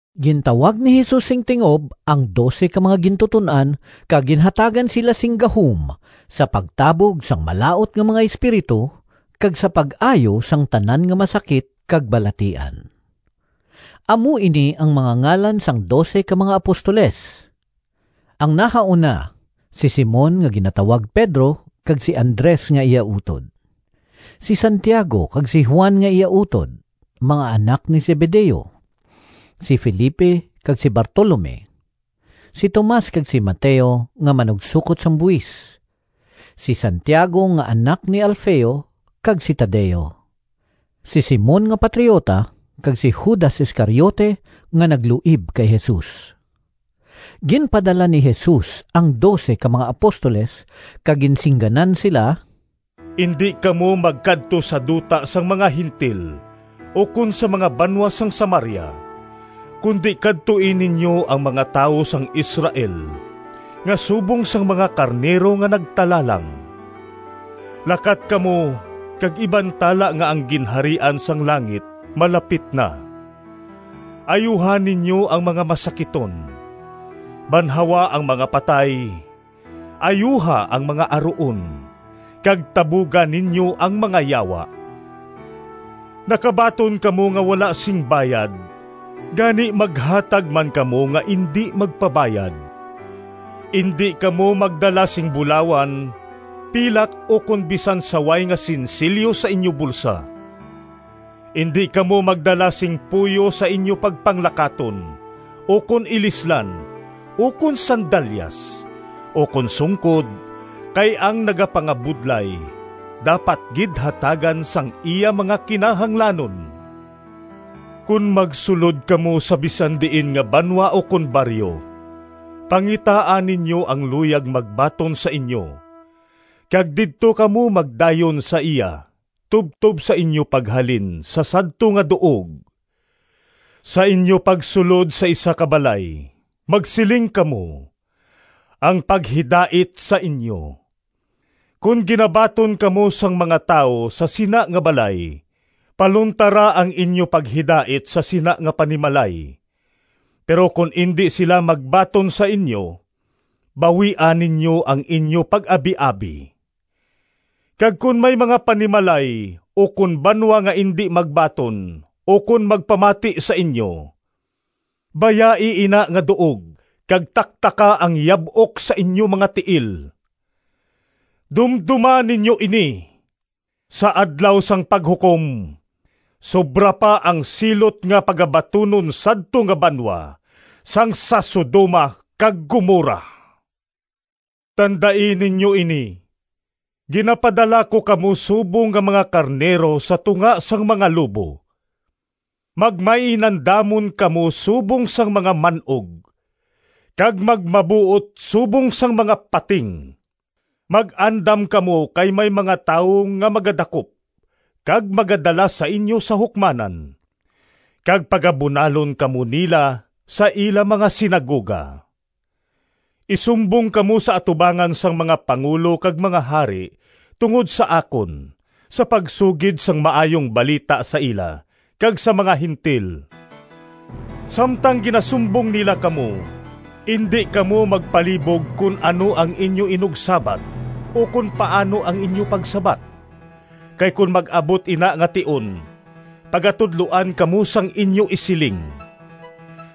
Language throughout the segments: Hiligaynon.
Gintawag ni Jesus sing tingob ang dose ka mga gintuton-an kag ginhatagan sila sing gahom sa pagtabog sang malaut nga mga espiritu, kag sa pag-ayo sang tanan nga masakit kag balatian. Amo ini ang mga ngalan sang dose ka mga apostoles: ang nahauna, si Simon nga ginatawag Pedro kag si Andres nga iya utod; si Santiago kag si Juan nga iya utod, mga anak ni Zebedeo; si Felipe kag si Bartolome; si Tomas kag si Mateo nga manugsokot sang buhis; si Santiago nga anak ni Alfeo kag si Tadeo; si Simon nga patriota kag si Judas Iscariote, nga nagluib kay Jesus. Ginpadala ni Jesus ang dose ka mga apostoles kag ginsingganan sila: “Indi kamo magkadto sa duta sang mga Gentil ukon sa mga banwa sang Samaria, kundi kadtoi ninyo ang mga tawo sang Israel nga subong sang mga karnero nga nagtalalang. Lakat kamo kag ibantala nga ang Ginharian sang langit malapit na! Ayuha ninyo ang mga masakiton, banhawa ang mga patay, ayuha ang mga aruon, kag tabuga ninyo ang mga yawa. Nakabaton kamo nga wala sing bayad, gani maghatag man kamo nga indi magpabayad. Indi kamo magdala sing bulawan, pilak ukon bisan saway nga sinsilyo sa inyo bulsa. Indi kamo magdala sing puyo sa inyo pagpanglakaton, ukon ilislan, ukon sandalyas, ukon sungkod, kay ang nagapangabudlay dapat gid hatagan sang iya mga kinahanglanon. “Kon magsulod kamo sa bisan diin nga banwa ukon baryo, pangitaa ninyo ang luyag magbaton sa inyo, kag didto kamo magdayon sa iya tubtob sa inyo paghalin sa sadto nga duog. Sa inyo pagsulod sa isa ka balay magsiling kamo, ‘Ang paghidait sa inyo.’ Kon ginabaton kamo sang mga tawo sa sina nga balay, paluntara ang inyo paghidait sa sina nga panimalay. Pero kon indi sila magbaton sa inyo, bawia ninyo ang inyo pag-abiabi. Kag kon may mga panimalay ukon banwa nga indi magbaton ukon magpamati sa inyo, bayai ina nga duog kag taktaka ang yab-ok sa inyo mga tiil. Dumdoma ninyo ini! Sa Adlaw sang Paghukom, sobra pa ang silot nga pagabatunon sadto nga banwa sang sa Sodoma kag Gomorra!” “Tandai ninyo ini! Ginapadala ko kamo subong nga mga karnero sa tunga sang mga lobo. Magmainandamon kamo subong sang mga man-og, kag magmabuot subong sang mga pating. Mag-andam kamo kay may mga tawo nga magadakop kag magadala sa inyo sa hukmanan, kag pagabunalon kamo nila sa ila mga sinagoga. Isumbong kamo sa atubangan sang mga pangulo kag mga hari tungod sa akon, sa pagsugid sang Maayong Balita sa ila kag sa mga Gentil. Samtang ginasumbong nila kamo, indi kamo magpalibog kon ano ang inyo inugsabat ukon paano ang inyo pagsabat, kay kon mag-abot ina nga tion pagatudloan kamo sang inyo isiling.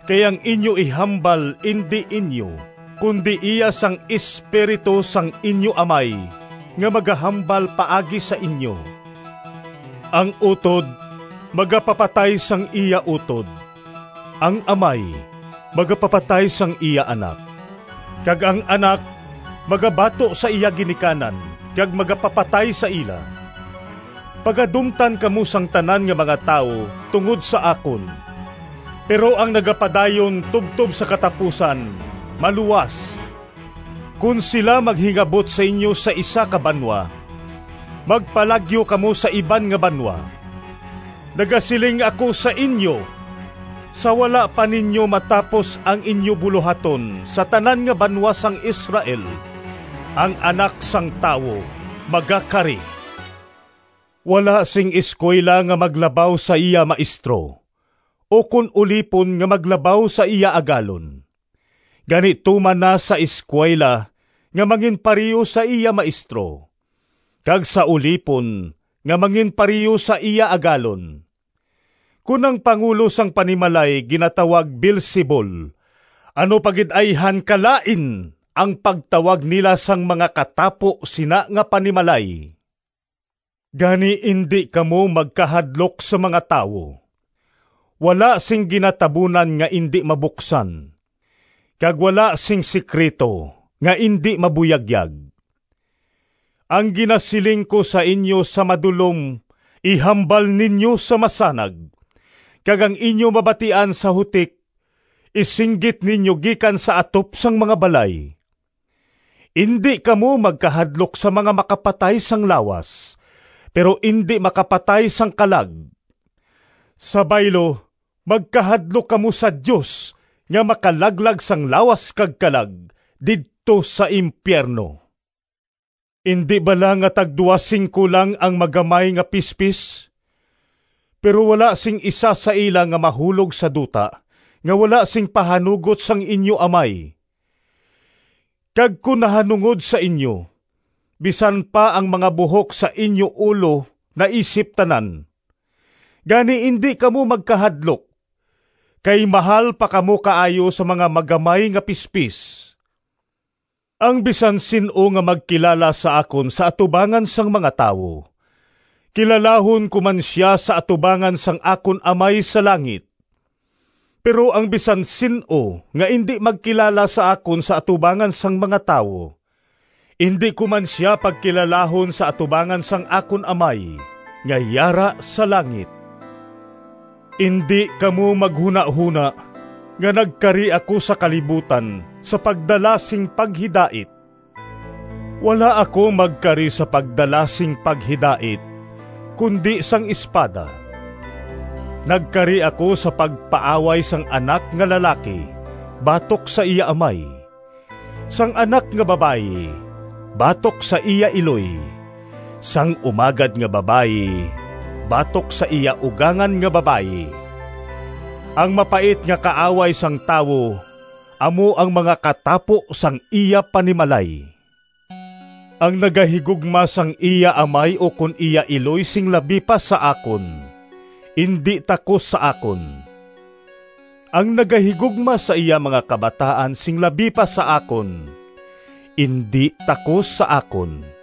Kay ang inyo ihambal indi inyo kundi iya sang Espiritu sang inyo Amay nga magahambal paagi sa inyo. “Ang utod magapapatay sang iya utod, ang amay magapapatay sang iya anak, kag ang anak magabato sa iya ginikanan kag magapapatay sa ila. Pagadumtan kamo sang tanan nga mga tawo tungod sa akon, pero ang nagapadayon tubtob sa katapusan maluwas. Kon sila maghingabot sa inyo sa isa ka banwa, magpalagyo kamo sa iban nga banwa. Nagasiling ako sa inyo, sa wala pa ninyo matapos ang inyo bulohaton sa tanan nga banwa sang Israel ang Anak sang Tawo magakari. “Wala sing eskuwela nga maglabaw sa iya maestro, ukon ulipon nga maglabaw sa iya agalon. Gani tuman na sa eskuwela nga manginpareho sa iya maestro, kag sa ulipon nga manginpareho sa iya agalon. Kon ang pangulo sang panimalay ginatawag Beelzebul, ano pa gid ayhan kalain ang pagtawag nila sang mga katapo sina nga panimalay!” “Gani, indi kamo magkahadlok sa mga tawo. Wala sing ginatabunan nga indi mabuksan, kag wala sing sekrito nga indi mabuyagyag. Ang ginasiling ko sa inyo sa madulom ihambal ninyo sa masanag, kag ang inyo mabatian sa hutik isinggit ninyo gikan sa atop sang mga balay. Indi kamo magkahadlok sa mga makapatay sang lawas pero indi makapatay sang kalag; sa baylo magkahadlok kamo sa Dios nga makalaglag sang lawas kag kalag didto sa impiyerno. Indi bala nga tagduha singko lang ang magamay nga pispis? Pero wala sing isa sa ila nga mahulog sa duta nga wala sing pahanugot sang inyo Amay. Kag kon nahanungod sa inyo, bisan pa ang mga buhok sa inyo ulo naisip tanan. Gani indi kamo magkahadlok, kay mahal pa kamo kaayo sa mga magamay nga pispis!” “Ang bisan sin-o nga magkilala sa akon sa atubangan sang mga tawo, kilalahon ko man sia sa atubangan sang akon Amay sa langit. Pero ang bisan sin-o nga indi magkilala sa akon sa atubangan sang mga tawo, indi ko man sia pagkilalahon sa atubangan sang akon Amay nga yara sa langit.” “Indi kamo maghunahona nga nagkari ako sa kalibutan sa pagdala sing paghidait. Wala ako magkari sa pagdala sing paghidait kundi sang espada. Nagkari ako sa pagpaaway sang anak nga lalaki batok sa iya amay, sang anak nga babayi batok sa iya iloy, sang umagad nga babayi batok sa iya ugangan nga babayi. Ang mapait nga kaaway sang tawo amo ang mga katapo sang iya panimalay. “Ang nagahigugma sang iya amay ukon iya iloy sing labi pa sa akon, indi takos sa akon; ang nagahigugma sa iya mga kabataan sing labi pa sa akon, indi takos sa akon.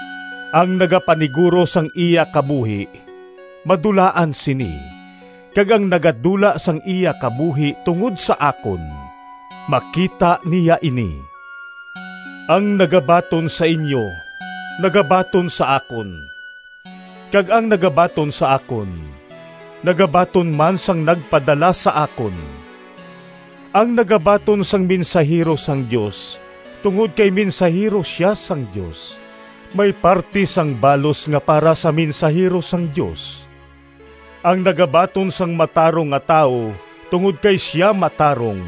Ang nagapaniguro sang iya kabuhi madulaan sini; kag ang nagadula sang iya kabuhi tungod sa akon makita niya ini.” “Ang nagabaton sa inyo nagabaton sa akon; kag ang nagabaton sa akon nagabaton man sang nagpadala sa akon. Ang nagabaton sang mensahero sang Dios tungod kay mensahero sia sang Dios may parti sang balos nga para sa mensahero sang Dios. Ang nagabaton sang matarong nga tawo tungod kay sia matarong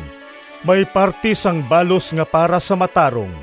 may parti sang balos nga para sa matarong.